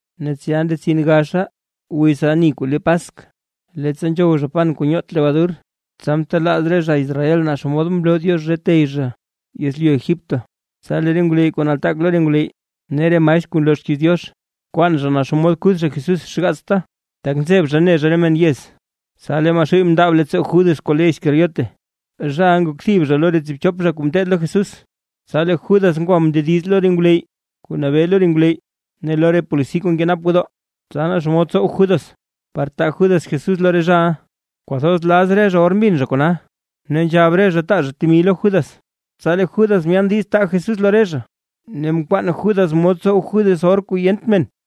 Ne tsya ndetsin gaxa wiz ani kuu le Paskw, leettsa nzhow zha pan kuu nyoot lebadur, tsa ntelaaz re zha Israel naa xomod mloo Diox re tey zha yezlyu Egipto. Tsa lee re ngwleyy kuu nataak lo re ngwleyy, ne re maestr kuu nloo xkiiz Diox, nkwaan zha naa xomod kuth zha Jesús xgaatsta, tak nzeb zha ne zha re men yez. Tsa lee Maxuuy mndaab leettsoo Judas kuu le Iscariote, zhaʼa nak thib zha lo re tsiibchop zha kuu mteed lo Jesús. Tsa lee Judas ngwa mndediz lo re ngwleyy kuu nabee lo re ngwleyy ne lo re polisi kuu nkenap gwodoo, tsa naa xomod tsow Judas par taa Judas Jesús lo re zhaʼa. Kwathoz laz re zha or mbin zha kona, ne nzhab re zha taa zha temi lo Judas. Tsa lee Judas myaan diiz taa Jesús lo re zha, ne mkwaan Judas mod tsow Judas or kuu yent men.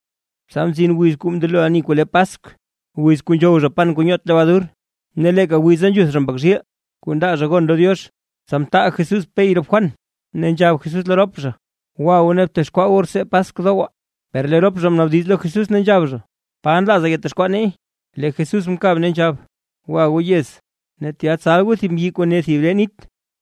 Tsa mzin wiz kuu ndelo ani kuu le Paskw, wiz kuu nzhow zha pan kuu nyoot lebadur, ne leeka wiza nzhuth zha mbak zhiil kuu ndaa zha gon lo Diox. Tsa mtaal Jesús Pey rop Juan ne nzhab Jesús lo rop zha: ―Gwa goo ne btexkwaa goo rtsee Paskw dowaa. Per lee rop zha mnaabdiz lo Jesús, ne nzhab zha: ―¿Pa nlaaza yatexkwaa neey? Lee Jesús mkab, ne nzhab: ―Gwa goo yez, ne tya tsal goo thib mbyi kuu ne thib ree nit,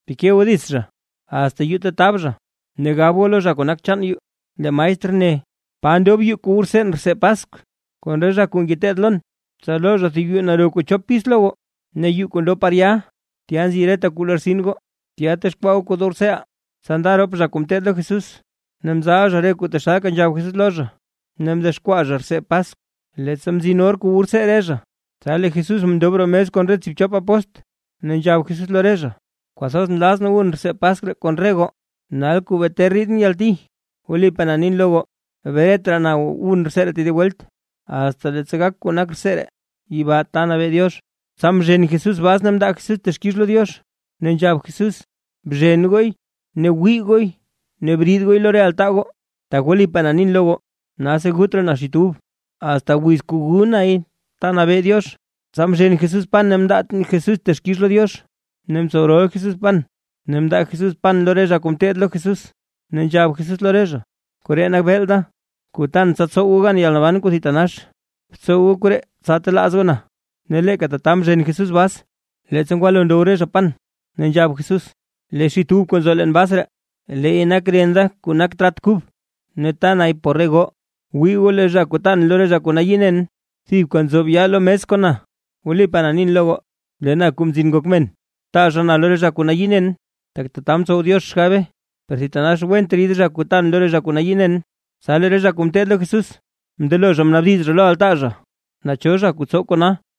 teke goo dits zha, asta yuu ta tab zha, ne gab goo lo zha kuu nak chaan yuu: “Lee maestr ne: ¿Pa ndob yuu ta wu rtseen rtsee Paskw kon re zha kuu ngeteed lon?” Tsa loo zha thib yuu naro kuu chop pis lo goo, ne yuu kuu ndob par ya tya nziʼa reta kuu lortsin goo, tya texkwaa goo kuu dow rtseeʼaa. Tsa nda rop zha kuu ngeteed lo Jesús, ne mzal zha re kuu taxalka nzhab Jesús lo zha, ne mdexkwaa zha rtsee Paskw. Leettsa mzin or kuu wu rtsee re zha, tsa lee Jesús mndob roo mes kon re tsiibchop apóstl. Ne nzhab Jesús lo re zha: ―Kwathoz nlazʼn wun rtsee Paskw ree kon re goo, nal kuu bee ter riidʼn yalti. Wlipaa na nin lo goo, bret raa na wun rtsee ree tedib welt, asta leettsa gak kuu nak rtsee ree yibaa ta nabee Diox. Tsa mzhen Jesús bas ne mndaa Jesús texkix lo Diox, ne nzhab Jesús: ―Bzhen gooy ne gwii gooy ne briid gooy lo re altaa goo. Tak wlipaa na nin lo goo, nalsi gut raa na xit ub, asta wiz kuu gu nay ta nabee Diox. Tsa mzhen Jesús pan ne mndaa Jesús texkix lo Diox, ne mtsow rol Jesús pan. Ne mndaa Jesús pan lo re zha kuu ngeteed lo Jesús, ne nzhab Jesús lo re zha: ―Koree nak beel da, kuu tan tsa tsow goo gan yalnaban kuu thitanax. Btsow goo koree tsa telaaz goo na. Ne leeka tata mzhen Jesús bas, leettsa ngwalo ndow re zha pan, tsa nzhab Jesús: ―Lee xit ub kuu nzo leen bas ree, leey nak ren da kuu nak trat kub, ne ta nay por re goo. Wii goo, lee zha kuu taan lo re zha kuu nayii nen, thibka nzob yaa lo mes kon na. Wlipaa na nin lo goo, lee na Kuu Mzin Ngok Men, taa zha na lo re zha kuu nayii nen, tak tata mtsow Diox xgabe. ¡Per thitanax went rid zha kuu taan lo re zha kuu nayii nen! Tsa lee re zha kuu ngeteed lo Jesús, mndelo zha mnaabdiz zha lo altaa zha, naa cho zha kuu tsow kona.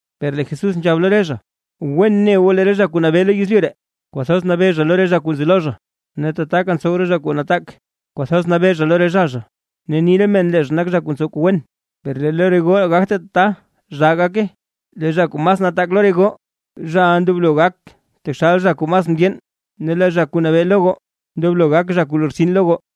Per lee Jesús nzhab lo re zha: ―Wen ne goo lee re zha kuu nabee lo yezlyu ree, kwathoz nabee zha lo re zha kuu nzi lo zha, ne tataka ntsow re zha kuu nataak kwathoz nabee zha lo re zha zha, ne ni re men lee zha nak zha kuu ntsow kuu wen. Per lo re goo gagte tata zhaa gake. Lee zha kuu mas nataak lo re goo zhaʼa ndoblo gak taxal zha kuu mas mndyeen, ne lee zha kuu nabee lo goo ndoblo gak kuu lortsin lo goo.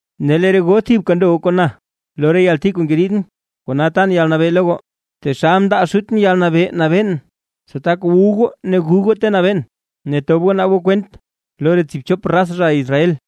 ’Ne lee re goo thibka ndo goo kon na lo re yalti kuu ngeriidʼn. Kona tan yalnabee nabee goo, taxal mndaa Xutʼn yalnabee nabeen, tsa tak wu goo ne gu goo ta nabeen, ne tob goo naab goo kwent lo re tsiibchop raz zha Israel.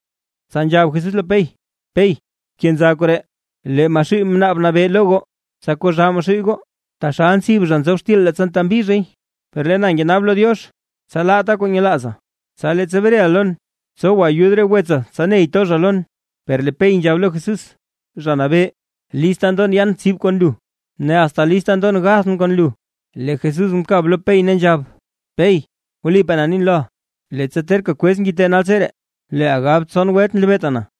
Tsa nzhab Jesús lo Pey: ―Pey, bkenza koree. Lee Maxuuy mnaab nabee lo goo, tsa koo zhaa Maxuuy goo, taxal ntsib zha nzob xtil leettsa ntembi zhay. Per lee na ngenaab lo Diox, tsa laata kuu nyelaaza. Tsa leettsa breʼa lon, tsowa ayud re wetsa tsa ney to zha lon. Per lee Pey nzhab lo Jesús: ―¡Zha Nabee! Lista ndon yan tsib kon lu, ne asta lista ndon gathʼn kon lu. Lee Jesús mkab lo Pey ne nzhab: ―Pey, wlipaa na nin loʼa, leettsa terka kwez ngite naltseree leeʼa gab tson welt nlebeeta na.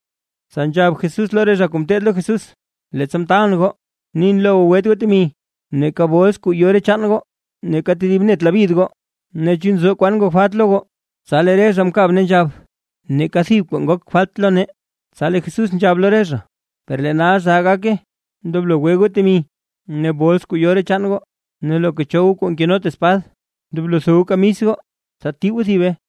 Tsa nzhab Jesús lo re zha kuu ngeteed lo Jesús: ―Leettsa mtaalʼn goo, nin lo goo gwet goo temi, neeka bols kuu yo re chaan goo, neeka tedib net labyid goo. Ne, ¿chu nzo kwan ngok falt lo goo? Tsa lee re zha mkab ne nzhab: ―Neeka thib kwaa ngogt falt lo nee. Tsa lee Jesús nzhab lo re zha: ―Per lee nal zhaa nake; ndoblo gwe goo temi ne bols kuu yo re chaan goo. Ne loka cho goo kuu nkenot espad, ndoblo tho goo kamis goo tsa tii goo thibe.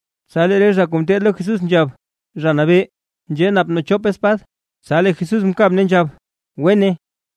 Tsa lee re zha kuu ngeteed lo Jesús nzhab: ―Zha Nabee, nzhee nap nee chop espad. Tsa lee Jesús mkab ne nzhab: ―Wene.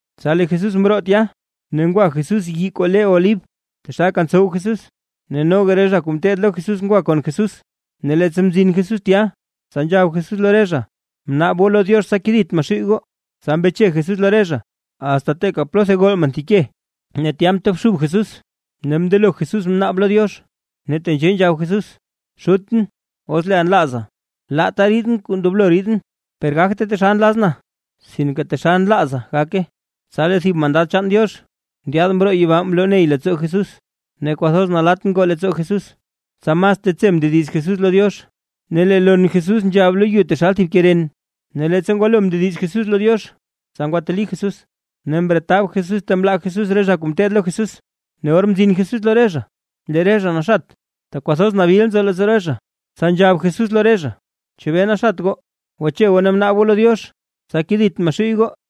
Tsa lee Jesús mroo tya, ne ngwa Jesús yii kuu le Olib taxalka ntsow Jesús, ne noga re zha kuu ngeteed lo Jesús ngwa kon Jesús. Ne leettsa mzin Jesús tya, tsa nzhab Jesús lo re zha: ―Bnaab goo lo Diox tsa kedit Maxuuy goo. Tsa mbeche Jesús lo re zha, asta teeka plotha gol men thib ke. Ne tya mtobxub Jesús ne mndelo Jesús mnaab lo Diox. Ne tenzhee nzhab Jesús: ―Xutʼn, os leeʼa nlaaza, laata riidʼn re kuu ndoblo riidʼn, per gagte taxal nlazʼn, sinke taxal nlaaza gake. Tsa lee thib mandad chaan Diox ndyaad mroo yibaa mloney leettsoo Jesús. Ne kwathoz nalatt ngoo leettsoo Jesús, tsa mas tetse mndediz Jesús lo Diox. Ne lee lon Jesús nzhab lo yu taxal thib ke ren. Ne leettsa ngwalo mndediz Jesús lo Diox, tsa ngwateli Jesús, ne mretab Jesús ta mlaa Jesús re zha kuu ngeteed lo Jesús. Ne or mzin Jesús lo re zha, lee re zha naxat, tak kwathoz nabil nzo leettsoo re zha. Tsa nzhab Jesús lo re zha: ―¿Chebee naxat goo? Gwache goo ne bnaab goo lo Diox, tsa kedit Maxuuy goo.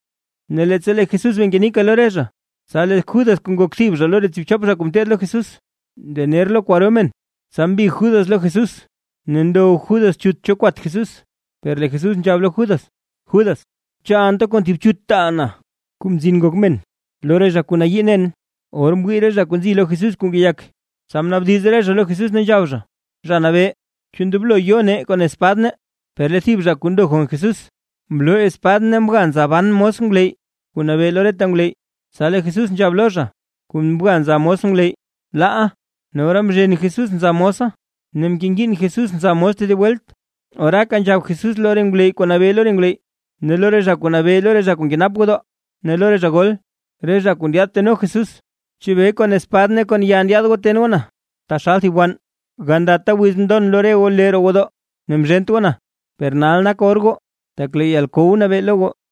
Ne leettsa lee Jesús bee ngenika lo re zha, tsa lee Judas kuu nak thib zha lo re tsiibchop zha kuu mteed lo Jesús, ndener lo kwaro men. Tsa mbig Judas lo Jesús ne ndow Judas chut cho kwat Jesús. Per lee Jesús nzhab lo Judas: ―Judas, ¿chu anta kon thib chut taaʼa na, Kuu Mzin Ngok Men lo re zha kuu nayii nen? Or mwii re zha kuu nzi lo Jesús kuu ngeyak, tsa mnaabdiz re zha lo Jesús ne nzhab zha: ―Zha Nabee, ¿chu ndoblo yo nee kon espad nee? Per lee thib zha kuu ndo kon Jesús, mloo espad ne mga zha nza ban mos ngwleyy kuu nabee lo reta ngwleyy. Tsa lee Jesús nzhab lo zha kuu mga nza mos ngwleyy: ―¡Laa! Ne ora mzhen Jesús nza mosa ne mkengiin Jesús nza mos tedib welt. Oraaka nzhab Jesús lo re ngwleyy kuu nabee lo re ngwleyy ne lo re zha kuu nabee lo re zha kuu nkenap gwodoo, ne lo re zha gol, re zha kuu ndyaad teno Jesús: ―¿Chebee kon espad ne kon ya ndyaad goo ten goo na taxal thib wann? Gandata wiz mndon lo re goo lee roo gwodoo, ne mzhent goo na. Per nal nak or goo, tak lee yalkow nabee lo goo.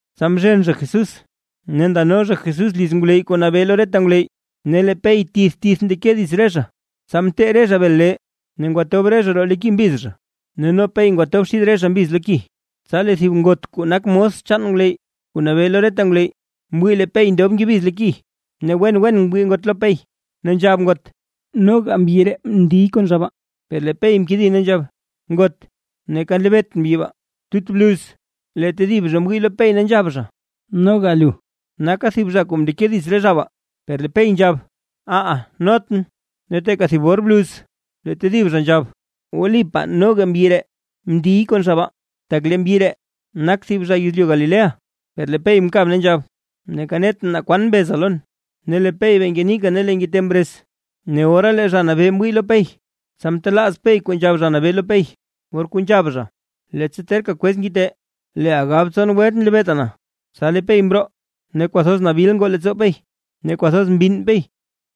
Tsa mzhen zha Jesús ne ndano zha Jesús liz ngwleyy kuu nabee lo reta ngwleyy, ne lee Pey tith tith ndeke dits re zha. Tsa mtee re zha bel lee, ne mndob re zha roo lo ki mbiz zha. Ne no Pey mndob xid re zha mbiz lo ki. Tsa lee thib ngot kuu nak mos chaan ngwleyy kuu nabee lo reta ngwleyy, mwii lee Pey ndob ngebiz lo ki, ne wen wen mwii ngot lo Pey ne nzhab ngot: ―Noga mbyi ree mndiy kon zha baa. Per lee Pey mkedi ne nzhab: ―Ngot, neeka nlebeetʼn mbyi baa. Tut bluz, lee tedib zha mwii lo Pey, ne nzhab zha: ―Noga lu naka thib zha kuu mndeke dits re zha baa. Per lee Pey nzhab: ―¡Aha, notʼn! Ne teeka thib or bluz, lee tedib zha nzhab: ―Wlipaa noga mbyi ree ndiy kon zha baa, tak lee mbyi ree nak thib zha yezlyu Galilea. Per lee Pey mkab, ne nzhab: ―¡Neeka netʼn naa kwan mbeza lon! Ne lee Pey bee ngenika lee ngite mrez. Ne ora lee Zha Nabee mwii lo Pey, tsa mtelaaz Pey kuu nzhab Zha Nabee lo Pey, or kuu nzhab zha: “Leettsa terka kwez ngite, leeʼa gab tson welt nlebeeta na”. Tsa lee Pey mroo ne kwathoz nabil ngoo leettsoo Pey ne kwathoz mbinn Pey.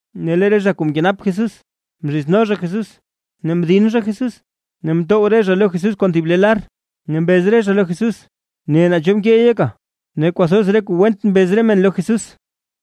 Ne lee re zha kuu mkenap Jesús mzhizno zha Jesús, ne mdin zha Jesús. Ne mtow re zha lo Jesús kon thib le lar, ne mbez re zha lo Jesús: ―¡Ne, naa cho mkeey yeka! Ne kwathoz re kuu went mbez re men lo Jesús.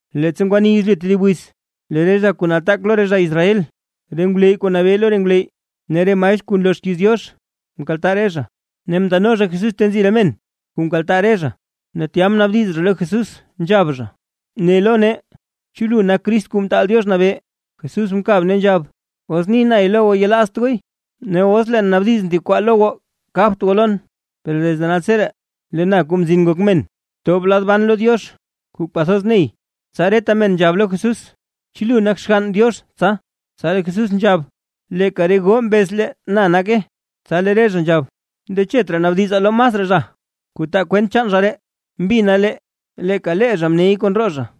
Leettsa ngwani yezlyu tedib wiz, lee re zha kuu nataak lo re zha Israel, re ngwleyy kuu nabee lo re ngwleyy ne re maestr kuu nloo xkiiz Diox, mkaltaa re zha, ne mndeno zha Jesús ta nzi re men kuu mkaltaa re zha. Ne tya mnaabdiz zha lo Jesús, nzhab zha: ―Ne lo nee, ¿chu lu nak Crist Kuu Mtaal Diox Nabee? Jesús mkab ne nzhab: ―Os ni nay lo goo yelaazt gooy. Ne os leen naabdizʼn thib kwaa lo goo, kabt goo lon. Per desde naltseree, lee na Kuu Mzin Ngok Men tob lad ban lo Diox kuu kwathoz ney. Tsa reta men nzhab lo Jesús: ―¿Chu lu nak Xgann Diox tsa? Tsa lee Jesús nzhab: ―Leeka re goo mbez, lee na nake. Tsa lee re zha nzhab: ―Ndechet raa naabdizaa lo masraa zha, kuu taa kwent chaan zha ree. Mbina lee leeka lee zha mney kon roo zha.